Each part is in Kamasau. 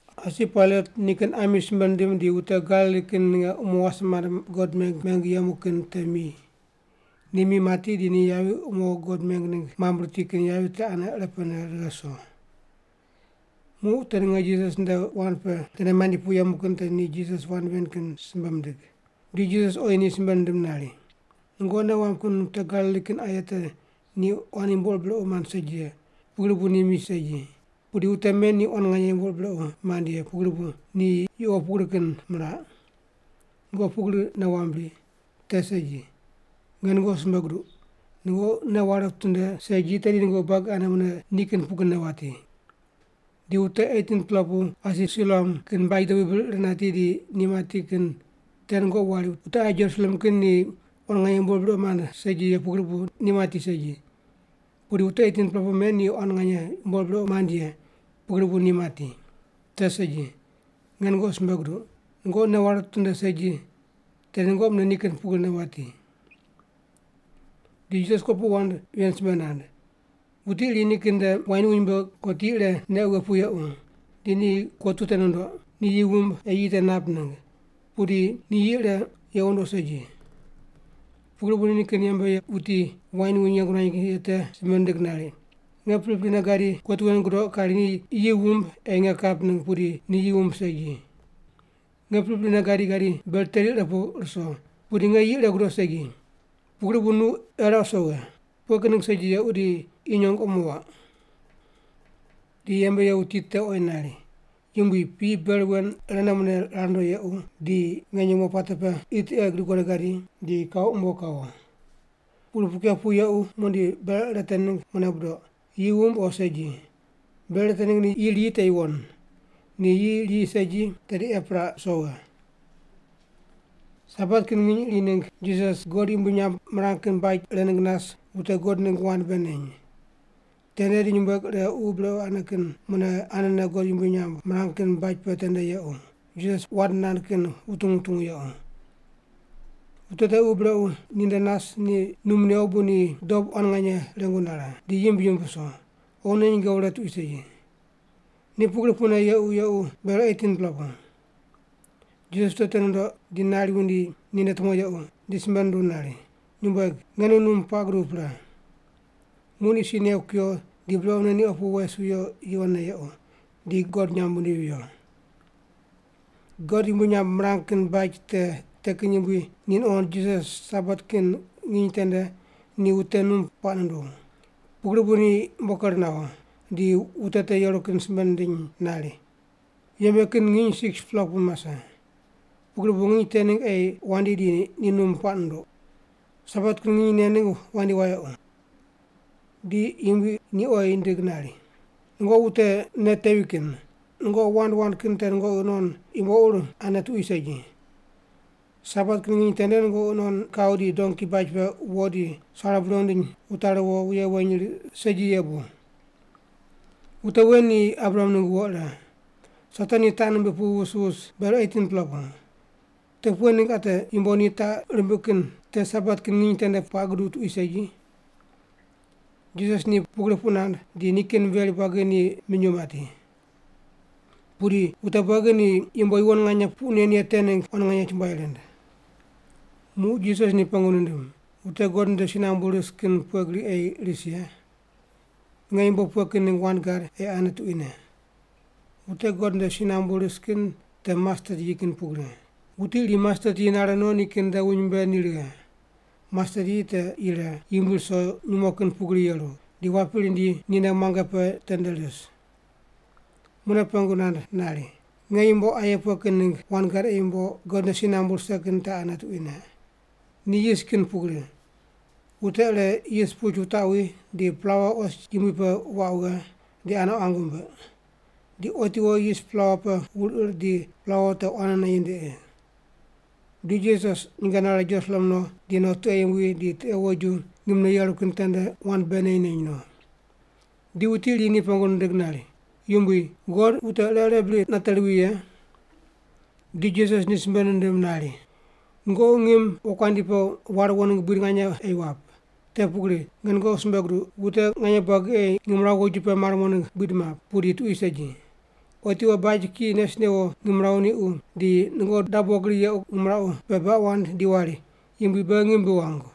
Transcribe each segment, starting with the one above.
Asi Pailat nikin ami simbe nindim di wute Galili kin ninge umo wase mande God meng meng yemu kin te mi. Ni mi mati di ni yavi te umo God meng ningg mambui riti kin yavi te ane irepene righe ruso. Muq wute ninge Jisas nde wand pe tende mandi pu yemu kin te ni Jisas wand ven kin simbe mindig. Di Jisas oyi ni simbe nindim nari, “Nungoqi nei wamb kin wute Galili kin aye te ni quan yumbo ur brequ mand segi ye, pugri bu ni mi segi, pudi wute men ni quan nganye yumbo ur brequ mand ye, pugri bu ni yuqo pugri kin miraq? Nungoqi pugri nei wamb bri? Te segi. Nge nungoqi simbe guduq, nungoqi nei ware witinde segi tedi nungoqi buagi ane mune ni kin pugrine wati. Di wute 18-pela pu asi Siloam kin baj dobui bir ir nati di ni mati kin te nungoqi wari wute aye Jerusalem kin ni quan nganye yumbo ur brequ mand segi ye pugri bu ni mati segi, pudi wute 18-pela pu men ni quan nganye yumbo ur brequ mand ye pugri bu ni mati? Te segi. Nge nungoqi simbe guduq. Nungoqi nei ware witinde segi, tedi nungoqi mune ni kin pugrine wati.” Di Jisas kopuqu wand ven simbe nand: “Wuti iri nikin nde wain wuny mbe kotu ire neq wughe pu yequ. Di ni no kotu te nundoq, ni yi wumb ei yi te nap ningg, pudi ni yi ire yequ nundoq segi. Pugri bu ni nikin yembe ye wuti wain wuny yeng nuany ye te simbe nindig nari, ‘Nge priprine gadi, kotu wen gudoq kari ni yi wumb ei nge kap ningg pudi yi wumb segi. Nge priprine gadi gadi ber teri ire pu ruso, pudi nge yi ire gudoq segi. Pugri bu nu eraq wuso wughe. Pughe kin ningg segi yequ di qi nyong omo wuaq?’ “Di yembe ye wuti te oyi nari, ‘Yumbui, piyi ber wen irene mune rar ndoq yequ, di nge nyumo puate pe qi tiqe gidiq godo gadi, di kau umbo kawo. Pugri puq kew pu yequ muqdi ber ire te ningg mune budoq, yi wumb o segi. Ber ire te ningg ni yi riyi te yuwon. Ni yi riyi segi, tedi epiraq wuso wughe’.” Sabat kin nginy iri ningg Jisas God yumbui nyamb mirang kin baj ire ningg nas wute God ningg wand bei neny. Tende di nyumbueg ire ququ brequ ane kin mune anene God yumbui nyamb mirang kin baj pe tende yequ, Jisas wand nand kin wutungu wutungu. Wute te ququ brequ ni nde nas ni num new bu ni dob quan nganye rengu nare, di yimb yimb wuso, oghine nyinge wure tuqui segi. Ni pugri pune yequ yequ ber 18-pela pu. Jisas wute te nundoq, di nari wundi ninde tumo yequ, di simbe nunduw nari, “Nyumbueg, nge nu num puaq guduw pre.” Muq ni si new kuyo di brequne ni opu wes wiyo yuwonne yequ, di God nyamb wundivi viyo. God yumbui nyamb mirang kin baj te kin yumbui ni nuqond Jisas Sabat kin nginy tende ni wute num puaq nunduw. Pugri bu ni umbo ker nawo, di wute te yeru kin simbe nindiny nari, “Yembe kin nginy 6-pela pu mase. Pugri bu nginy te ningg ei wandi di ni num puaq nunduq. Sabat kin nginy nen ningg wandi wayequ.” Di Yumbui ni oyi nindig nari, “Nungoqi wute nei tevi kin. Nungoqi wand wand kin te nungoqi non yumbo ur ane tuqui segi. Sabat kin nginy tende nungoqi non non nungoqi non kau di donki baj pe wo di sare bure wundiny wutari wo wuye weny riq segi ye bu? Wute wen ni Abraham ningg wo ire. Satan ni taq nimbiq pu wus wus ber 18-pela pu. Te pughe ningg ate yumbo ni taq rimbiq kin te Sabat kin nginy tende puaq guduw tuqui segi?” Jisas ni pugri puq nand di nikin veri buagi ni minyuw mati. Pudi wute buagi ni yumbo yuwon nganye puq nen ye te ningg quan nganye chumbuai rind. Muq Jisas ni pengu nindim, “Wute God nde si nambu ris kin pughe gri ei ris ye? Nge yumbo pughe kin ningg wand gad ei ane tuquine? Wute God nde si nambu ris kin te mastet yi kin pugri. Wuti iri mastet yi nare no nikin nde wuny mbe ni righe. Mastet yi te yire, yumbui ruso nyumo kin pugri yeru, di wapi rindi ninde muange pe tende ris.” Mune pengu nand nari, “Nge yumbo aye pughe kin ningg wand gad ei yumbo God nde si nambu rise kin ane tuquine? Ni yis kin pugri. Wute ire yis puch wutaqwi di plaua os yumbui pe waq wughe di ane quang wumbiq. Di otiwo yis plaua pe wur ir di plaua te quanene yindiqi.” Di Jisas nyinge nare Jerusalem no di no tiqe yumbui di tiqe woju ngimne yeru kin tende wand bei neny neny no. Di wuti iri ni pengu nindig nari, “Yumbui, God wute ire irene bri nate mowi ye?” Di Jisas ni simbe nindim nari, “Nungoqi ngim wokuandi pe war wo ningg buid nganye ei wap. Te pugri, nge nungoqi simbe guduq wute nganye buagi ei ngimrawu woju pe mar mo ningg buid map, pudi tuqui segi. Otiwo baj kiyi nes newo ngimrawu niqu, di nungoqi dabo gri yequ ngimrawu pe baq wand di wari, ‘Yumbui, beghi ngim bi wangu.’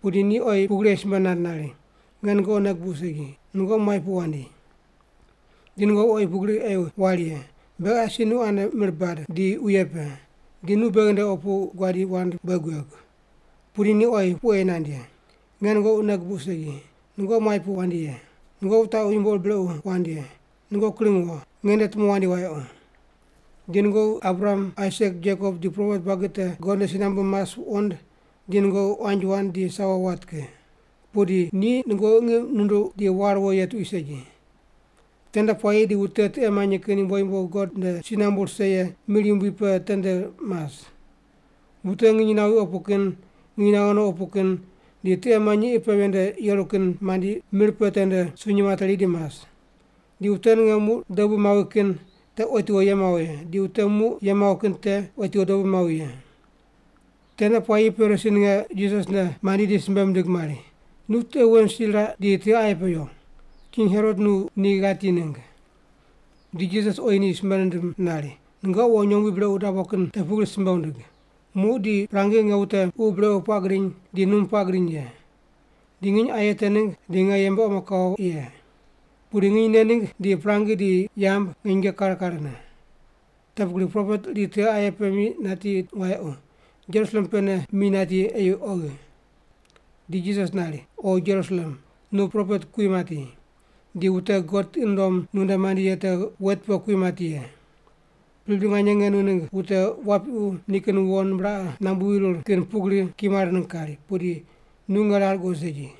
“Pudi ni oyi pugri ei simbe nand nari, ‘Nge nungoqi nei gubuq segi, nungoqi muai pu wandi.’ “Di nungoqi oyi pugri ei wari ye, ‘Beghi asi nu ane mir bad di wuye pe, di nu beghi nde opu guadi wand bei guegu.’ “Pudi ni oyi puq ei nand ye, ‘Nge nungoqi nei gubuq segi, nungoqi muai pu wandi ye. Nungoqi wutaqu yumbo ur brequ wand ye! Nungoqi kring wo, nge nde tumo wandi wayequ!’ “Di nungoqi Abraham, Aisak, Jekop di propet buagi te God nde si nambu mas wuqond di nungoqi quanji wand di sawo wat ki. Pudi ni nungoqi ngiq nunduq di war wo ye tuqui segi. Tende puayi di wute tiqe manyi kin yumbo yumbo God nde si nambu rise ye mir yumbui pe tende mas. Wute nginy nawi opu kin, nginy naghe no opu kin, di tiqe manyi qi pe ven nde yeru kin mandi mir pe tende sunyi materi di mas. Di wute ninge muq dobu mawi kin te otiwo ye mawo ye, di wute muq ye mawo kin te otiwo dobu mawi ye.” Tende puayine Parisi ninge Jisas nde mandi di simbe mindig mari, “Nu tiqe wen si raq di tiqe aye pe yo. King Herot nu ni ghati ningg.” Di Jisas oyi ni simbe nindim nari, “Nungoqi wo nyombui brequ dabo kin te pugri simbe wundig, ‘Muq di prangi nge wute ququ brequ puaq gidiny di num puaq gidiny ye. Di nginy aye te ningg di nge yembe omo kawo ye.’ Pudi nginy nen ningg di prangi di yamb nge nyinge kare karene. Te pugri propet iri tiqe aye pe mi nati wayequ, Jerusalem pene mi nati ei oghi.” Di Jisas nari, “O Jerusalem, nu propet kui mati, di wute God tiqi nundom nu nde mandi ye te wet pe kui mati ye. Pripri nganye nge nu ningg wute wapiqu nikin wo nimbraqe nambu wirir kin pugri kimar ningg kari, pudi nu nge rar guqoid segi.